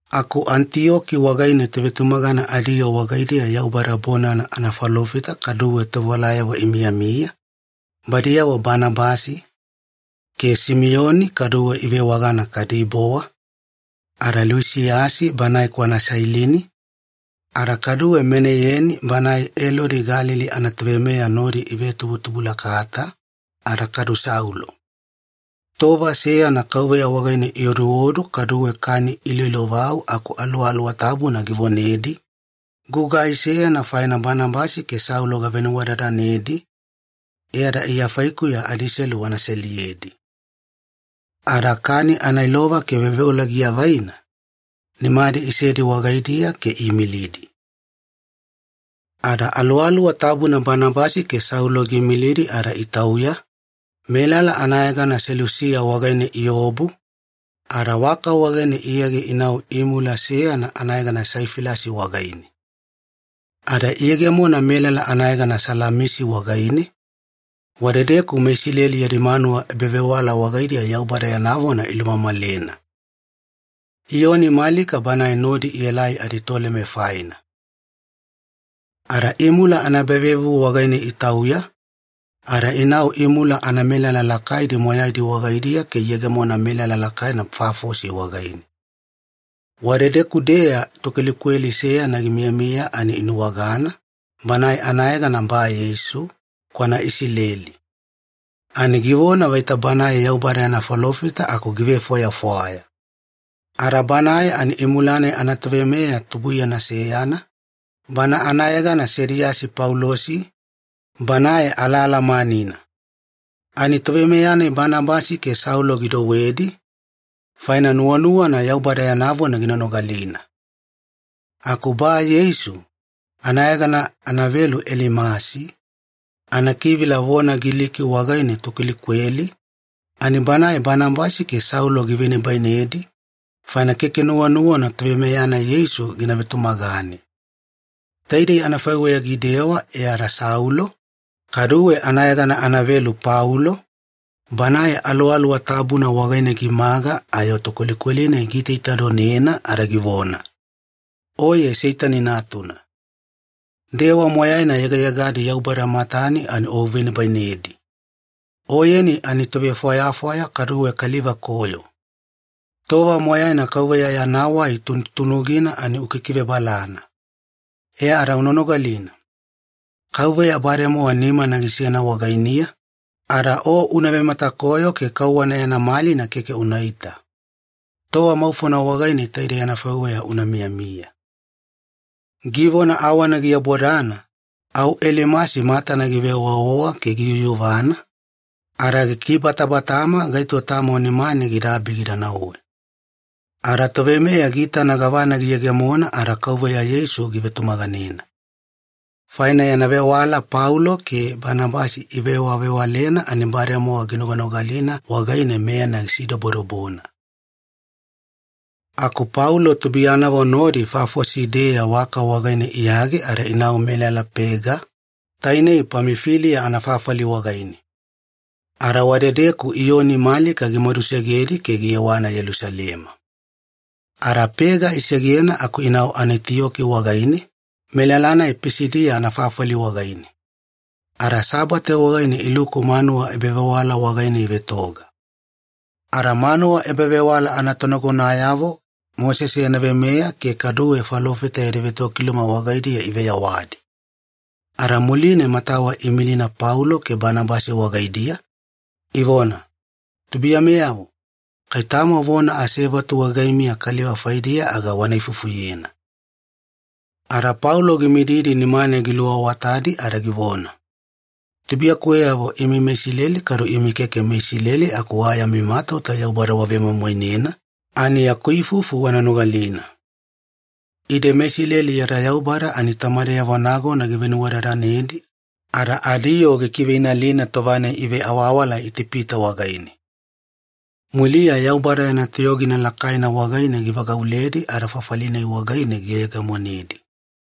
Aku Anitiyoki wagaine tovetumagana adiyoo wagaidiya Yaubada bonana anafalofita kaduwe tovewalayavo imiyamiya, badiyavo Banabasi, ke Simiyoni kaduwe ivewagana Kadibowa, ada Luisiyasi banae kwana Sailini, ada kaduwe Maneyeni banae Elodi Galili anatoveimeya nodi ivetubutubulakata, ada kadu Saulo. Tova seyana Kauveya wagaine ioduodu kaduwe kani iloilovau aku Aluwaluwa Tabuna givonedi, “Gugai seyana faina Banabasi ke Saulo gavenuwadadanedi, e ada Iya faikuya adiselu wana seliyedi.” Ada kani anailova ke veoveola giavaina, nimadi isedi wagaidiya ke iimilidi. Ada Aluwaluwa Tabuna Banabasi ke Saulo giimilidi ada itauya, melala anayegana Selusiya wagaine iobu, ada waka wagaine iyage inau imula seyana anayegana Saifilasi wagaine. Ada iyegemona melala anayegana Salamisi wagaine, wadedeku meIsileli yadi manuwa ebavewala wagaidiya Yaubada yana vona ilumamalena. Iyoni Malika banae nodi ielai aditoleme faina. Ada imula anaebavevuvu wagaine itauya, ada inau imula anamelala lakaidi moyaidi wagaidiya ke iyegemona melala lakaina Pafosi wagaine. Wadedeku-deya tokwelikweli seyana gimiyamiya ani inuwagana, banae anayegana Ba-Yeisu, kwana Isileli. Ani givona vaita banae Yaubada yana falofita aku givefwayafwaya. Ada banae ani imula-nai anatoveimeya tubuiyana seyana, bana anayegana Sediyasi Paulosi, banae alaalamanina. Ani toveimeya-nai Banabasi ke Saulo gidouwedi, faina nuwanuwana Yaubada yana vona gina nogalina. Aku Ba-Yeisu, anayegana anavelu Elimasi, anakivila vona Giliki wagaine ‘tokwelikweli’, ani banae Banabasi ke Saulo givenibainedi, faina keke nuwanuwana toveimeya-nai Yeisu gina vetumagane. Taidei anafaiweya gidewa e ada Saulo, kaduwe anayegana anavelu Paulo, banae Aluwaluwa Tabuna wagaine gimaga ayo tokwelikweli-nai giitaitadonena ada givona, “Oye Seitani natuna. Dewa moyaina yegayegadi Yaubada matane ani o uvenibainedi! Oyeni ani tovefwayafwaya kaduwe kaliva koyo. Tova moyaina Kauveya yana wai tunutunugina ani ukikivebalana. E ada una nogalina. Kauveya bademowa nimana gisena wagainiya, ada o una vematakoyo ke kauwana yana malina keke unaita. Tova maufona wagaine taidei anafaiweya una miyamiya.” Givona awana giabodana, au Elimasi matana giveowaowa ke giyuyuvana, ada gikibatabatama gaito tamo nimane gidaabi gida nauwe. Ada toveimeya giitana gavana giyegemona, ada Kauveya Yeisu givetumaganena. Faina yana vewala Paulo ke Banabasi ivewavewalena ani bademowa ginoganogalina wagaine, meyana gisidobodobona. Aku Paulo tubuiyanavo nodi Pafosi-deya waka wagaine iyage ada inau melala Pega, tainei Pamifiliya anafafali wagaine. Ada wadedeku Iyoni Malika gimadusegedi ke giyewana Yelusalema. Ada Pega isegena aku inau Anitiyoki wagaine, melala-nai Pisidiya anafafali wagaine. Ada Sabate wagaine iluku manuwa ebavewala wagaine ivetoga. Ada manuwa ebavewala anatonagonayavo Mosese yana veimeya ke kaduwe falofita yadi vetokiluma wagaidiya iveyawadi. Ada muline matawa iimilina Paulo ke Banabasi wagaidiya, ivona, “Tubuiyameyavo, kai tamo vona asevatu wagaimiya kaliva faidiya aga wana ifufuyena.” Ada Paulo gimididi nimane giluawatadi ada givona, “Tubuiyakuweyavo imi meIsileli kaduwe imi keke meIsileli aku wa yami matauta Yaubada wavemoimoinena, ani yaku ifufu wana nogalina. Ide meIsileli yada Yaubada ani tamadeyavo nagona givenuwadadanedi ada adiyoo gikiveinalina tova-nai iveawawala Itipita wagaine. Muliya Yaubada yana toyogina lakaina wagaine givagauledi ada fafali-nai wagaine giyegemonedi.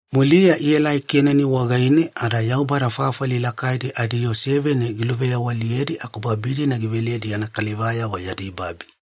Muliya ielai Kenani wagaine ada Yaubada fafali lakaidi adiyoo seveni giluveyawaliyedi aku babi-dina giveledi yana kalivayavo yadi babi.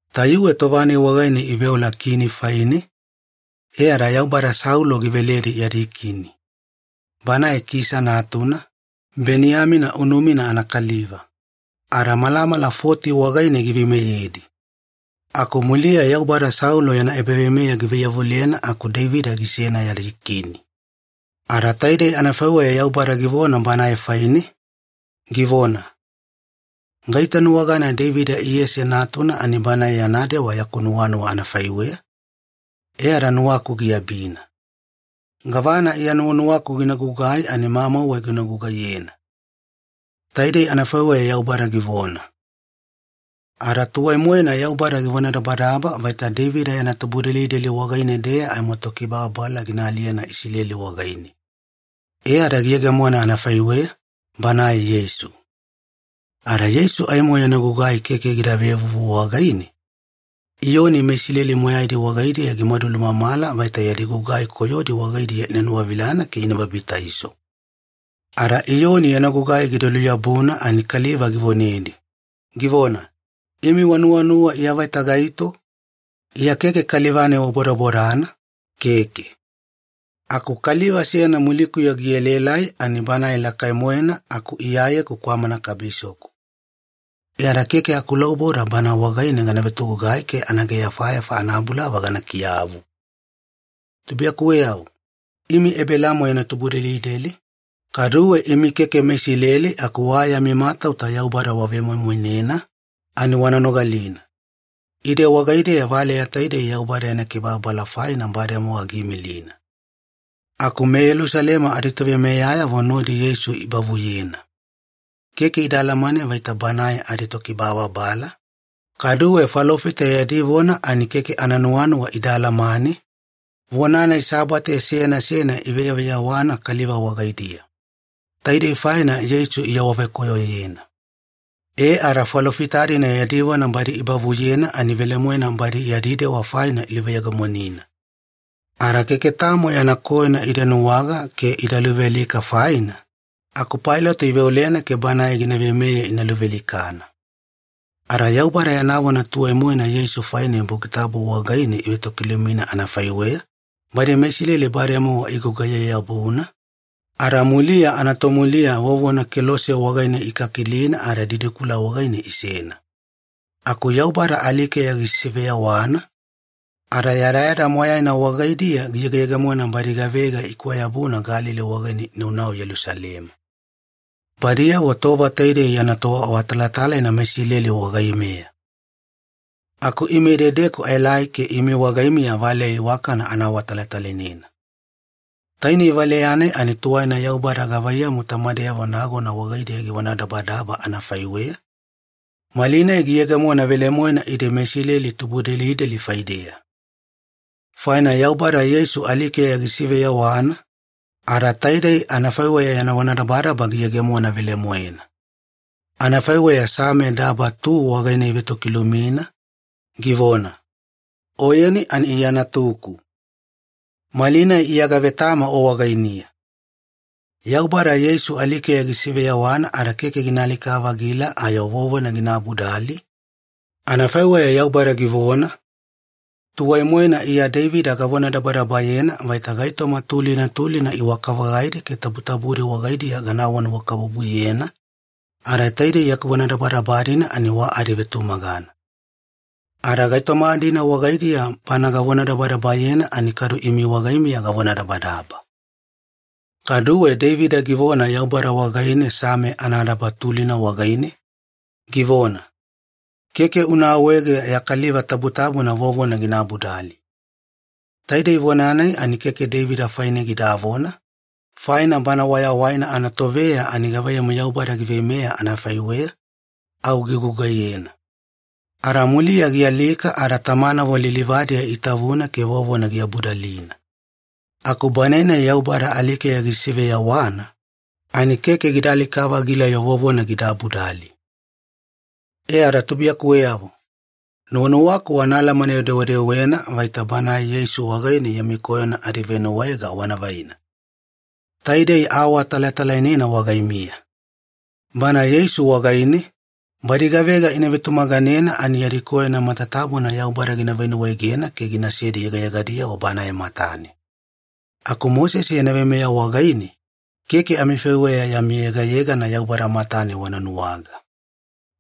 “Tayuwe tova-nai wagaine iveola kini faine, e ada Yaubada Saulo giveledi yadi kini. Banae Kisa natuna, Beniyamina unumina anakaliva. Ada malamala foti wagaine giveimeyedi. Aku muliya Yaubada Saulo yana ebaveimeya givaiyavulena aku Deivida gisena yadi kini. Ada taidei anafaiweya Yaubada givona banae faine, givona, ‘Gaitanuwagana Deivida Iyese natuna ani banae yana dewa yaku nuwanuwa anafaiweya, e ada nuwaku giabina. Gavana Iya nuwanuwaku gina gugai ani mamauwe gina gugaiyena.’ Taidei anafaiweya Yaubada givona. “Ada tuwai-moena Yaubada givonadabadaba vaita Deivida yana tubudelideli wagaine-deya aimo Tokibababala gina aliyena Isileli wagaine. E ada giyegemona anafaiweya, Banae Yeisu. Ada Yeisu aimo yana gugai keke gida vevuvu wagaine, Iyoni meIsileli moyaidi wagaidiya gimadu lumamala vaita yadi gugai koyodi wagaidiya ina nuwavilana ke ina babitaiso. Ada Iyoni yana gugai gida luyabuna ani kaliva givonedi, givona, ‘Imi wanuwanuwa Iya vaita gaito? Iya keke kaliva-nai wabodabodana, keke. Aku kaliva seyana mulikuya gielaelai ani Banae lakai-moena aku Iyayeku kwamana kabisoku. E ada keke akulauboda Bana wagaine gana vetogugai ke anaageyafayafa anabulava gana kiyavu.’ “Tubuiyakuweyavo, imi Ebelaamo yana tubudelideli, kaduwe imi keke meIsileli aku wa yami matauta Yaubada wavemoimoinena, ani wana nogalina. Ide wagaideya valeya taidei Yaubada yana kibababala faina bademowa giimilina. Aku meYelusalema aditoveimeyayavo nodi Yeisu ibavuyena. Keke ida alamane vaita Banae adiTokibababala, kaduwe falofita yadi vona ani keke ananuwanuwa ida alamane, vona-nai Sabate seyana seyana iveyaveyawana kaliva wagaidiya. Taidei faina Yeisu iawavekoyoyena. E ada falofita-dina yadi vona badi ibavuyena ani velemoena badi yadi dewa faina iluveyegemonina. Ada keke tamo yana koyona ida nuwaga ke ida luvealika faina, aku Pailato iveolena ke banae gina veimeye ina luvealikana. Ada Yaubada yana vona tuwaina-moena Yeisu faine Buki Tabu wagaine ivetokilumina anafaiweya, badi meIsileli bademowa igugaiye-yabuna, ada muliya anatomuliya vovona kelose wagaine ikakilina ada didikula wagaine isena. Aku Yaubada alikeya gisiveyawana, ada yadayada moyaina wagaidiya giyegeyegemona badi gavega ikwayabuna Galili wagaine inaunau Yelusalema. Badiyavo tova taidei yana toawatalatalaina meIsileli wagaimeya. “Aku ime idedeku aelai ke imi wagaimiya valeya iwakana ana awatalatalainena. Tainei valeya-nai ani tuwaina Yaubada gavaiyamu tamadeyavo nagona wagaidiya givonadabadaba anafaiweya, malinai giyegemona velemoena ide meIsileli tubudelideli faideya. Faina Yaubada Yeisu alikeya gisiveyawana, ada taidei anafaiweya yana vonadabadaba giyegemona velemoena. Anafaiweya Same daba tu wagaine ivetokilumina, givona, ‘Oyeni ani Iya Natuku. Malinai Iya gavetama O wagainiya.’ Yaubada Yeisu alikeya gisiveyawana ada keke gina alika-vagila ayo vovona gina abudali, anafaiweya Yaubada givona, ‘Tuwai-moena Iya Deivida gavonadabadabayena vaita gaitoma tulina tulina iwaka-vagaidi ke tabutabudi wagaidiya gana awanuwakabubuyena, ada taidei yaku vonadabadaba-dina ani wa adivetumagana. Ada gaitoma-dina wagaidiya bana gavonadabadabayena ani kadu imi wagaimiya gavonadabadaba.’ Kaduwe Deivida givona Yaubada wagaine Same anadaba tulina wagaine, givona, ‘Keke una awaege ya Kaliva Tabutabuna vovona gina abudali.’ Taidei vona-nai ani keke Deivida faine gidavona, faina bana wayawaina anatoveya ani gavaiyamu Yaubada giveimeya anafaiweya, au gigugaiyena. Ada muliya gialika ada tamanavo lilivadiya itavuna ke vovona giabudalina. Aku Banae-nai Yaubada alikeya gisiveyawana, ani keke gida alika-vagila-yo vovona gida abudali. “E ada tubuiyakuweyavo, nuwanuwaku wana alamane-dewedewena vaita Banae Yeisu wagaine yami koyona adivenuwaega wana vaina. Taidei aawatalatalainena wagaimiya. Bana Yeisu wagaine, badi gavega ina vetumaganena ani yadi koyona matatabuna Yaubada gina venuwaegena ke ginasedi yegayegadi Banae matane. Aku Mosese yana veimeya wagaine, keke amifaiweya yami yegayegana Yaubada matane wana nuwaga.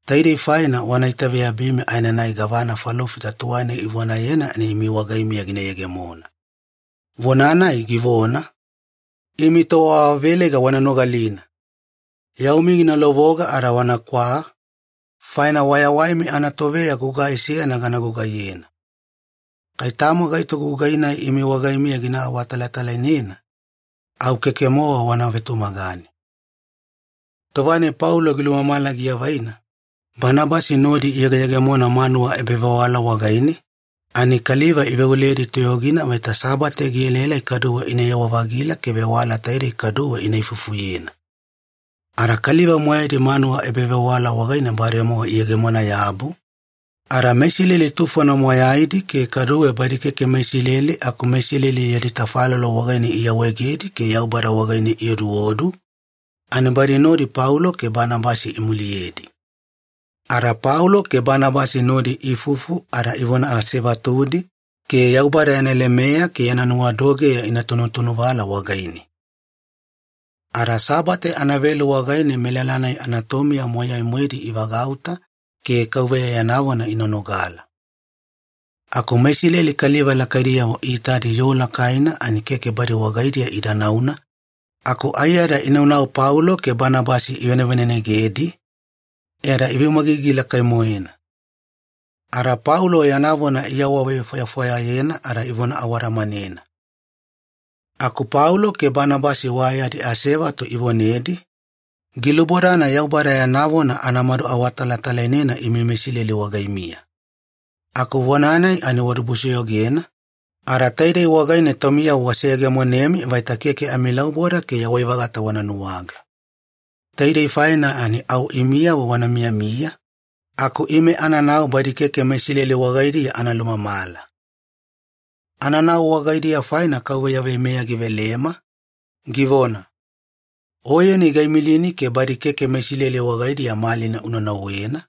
Taidei faina wana itaveyabimi aenanai gavana falofita tuwaina ivonayena ani imi wagaimiya gina yegemona. Vona-nai givona, ‘Imi toawaveleiga wana nogalina! Yaumi gina lovoga ada wanakwa, faina wayawaimi anatoveya gugai seyana gana gugaiyena. Kai tamo gaito gugai-nai imi wagaimiya gina awatalatalainena, au keke-mowa wana vetumagane.’” Tova-nai Paulo gilumamala giavaina, Banabasi nodi iyegeyegemona manuwa ebavewala wagaine, ani kaliva iveoledi toyogina vaita Sabate gielaelai kaduwe inayewa-vagila ke vewala taidei kaduwe ina ifufuyena. Ada kaliva moyaidi manuwa ebavewala wagaine bademowa iyegemona-yabu, ada meIsileli tufona moyaidi ke kaduwe badi keke meIsileli aku meIsileli yadi tafalolo wagaine iawaegedi ke Yaubada wagaine ioduodu, ani badi nodi Paulo ke Banabasi imuliyedi. Ada Paulo ke Banabasi nodi iifufu ada ivona asevatudi ke Yaubada yana lemeya ke yana nuwadogeya ina tunutunuvala wagaine. Ada Sabate anavelu wagaine melala-nai anatomiya moyai-moedi ivagauta ke Kauveya yana vona ina nogala. Aku meIsileli kaliva lakaidiyavo iitadi yoo lakaina ani keke badi wagaidiya ida nauna aku aiyada inaunau Paulo ke Banabasi ivanevanenegedi, e ada iveumagigi lakai-moena. Ada Paulo yana vona iawavefwayafwayayena ada ivona awadamanena. Aku Paulo ke Banabasi wa yadi asevatu ivonedi, “Gilubodana Yaubada yana vona anamadu awatalatalainena imi meIsileli wagaimiya. Aku vona-nai ani wadibusoyogena, ada taidei wagaine taumiyavo waseyegemonemi vaita keke amilauboda ke yawai-vagata wana nuwaga. Taidei faina ani au imiyavo wana miyamiya aku ime ananau badi keke meIsileli wagaidiya ana lumamala. Ananau wagaidiya faina Kauveya veimeya givelema, givona, ‘Oyeni gaimilini ke badi keke meIsileli wagaidiya malina una nauwena,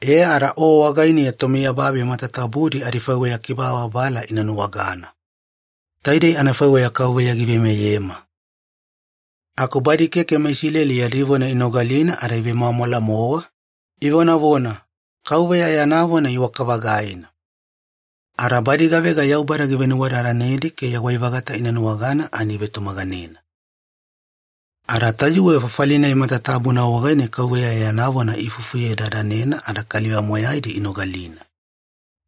e ada o wagainiya tomiyababi matatabudi adifaiweya kibababala ina nuwagana.’” Taidei anafaiweya Kauveya giveimeyema. Aku badi keke meIsileli yadi vona inogalina ada ivemwamwala-mowa, ivonavona, “Kauveya yana vona iwaka-vagaina.” Ada badi gavega Yaubada givenuwadadanedi ke yawai-vagata ina nuwagana ani ivetumaganena. Ada tayuwe fafali-nai matatabuna wagaine Kauveya yana vona iifufuyedadanena ada kaliva moyaidi inogalina.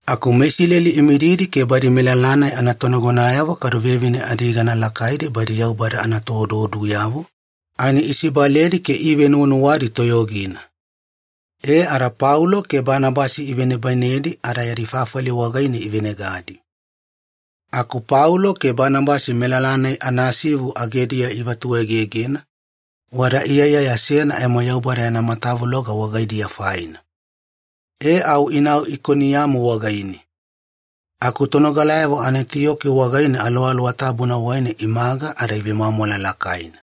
Aku meIsileli imididi ke badi melala-nai anatonagonayavo kadu vevine adiyegana lakaidi badi Yaubada anatooduoduyavo, ani isibaledi ke iivenuwanuwadi toyogina. E ada Paulo ke Banabasi ivenibainedi ada yadi fafali wagaine ivenegadi. Aku Paulo ke Banabasi melala-nai anasivu agediya ivatuegegena, wada iyaiyaya seyana aimo Yaubada yana matavuloga wagaidiya faina. E au inau Ikoniyamu wagaine. Aku tonogalayavo Anitiyoki wagaine Aluwaluwa Tabuna wagaine imaga ada ivemwamwala lakaina.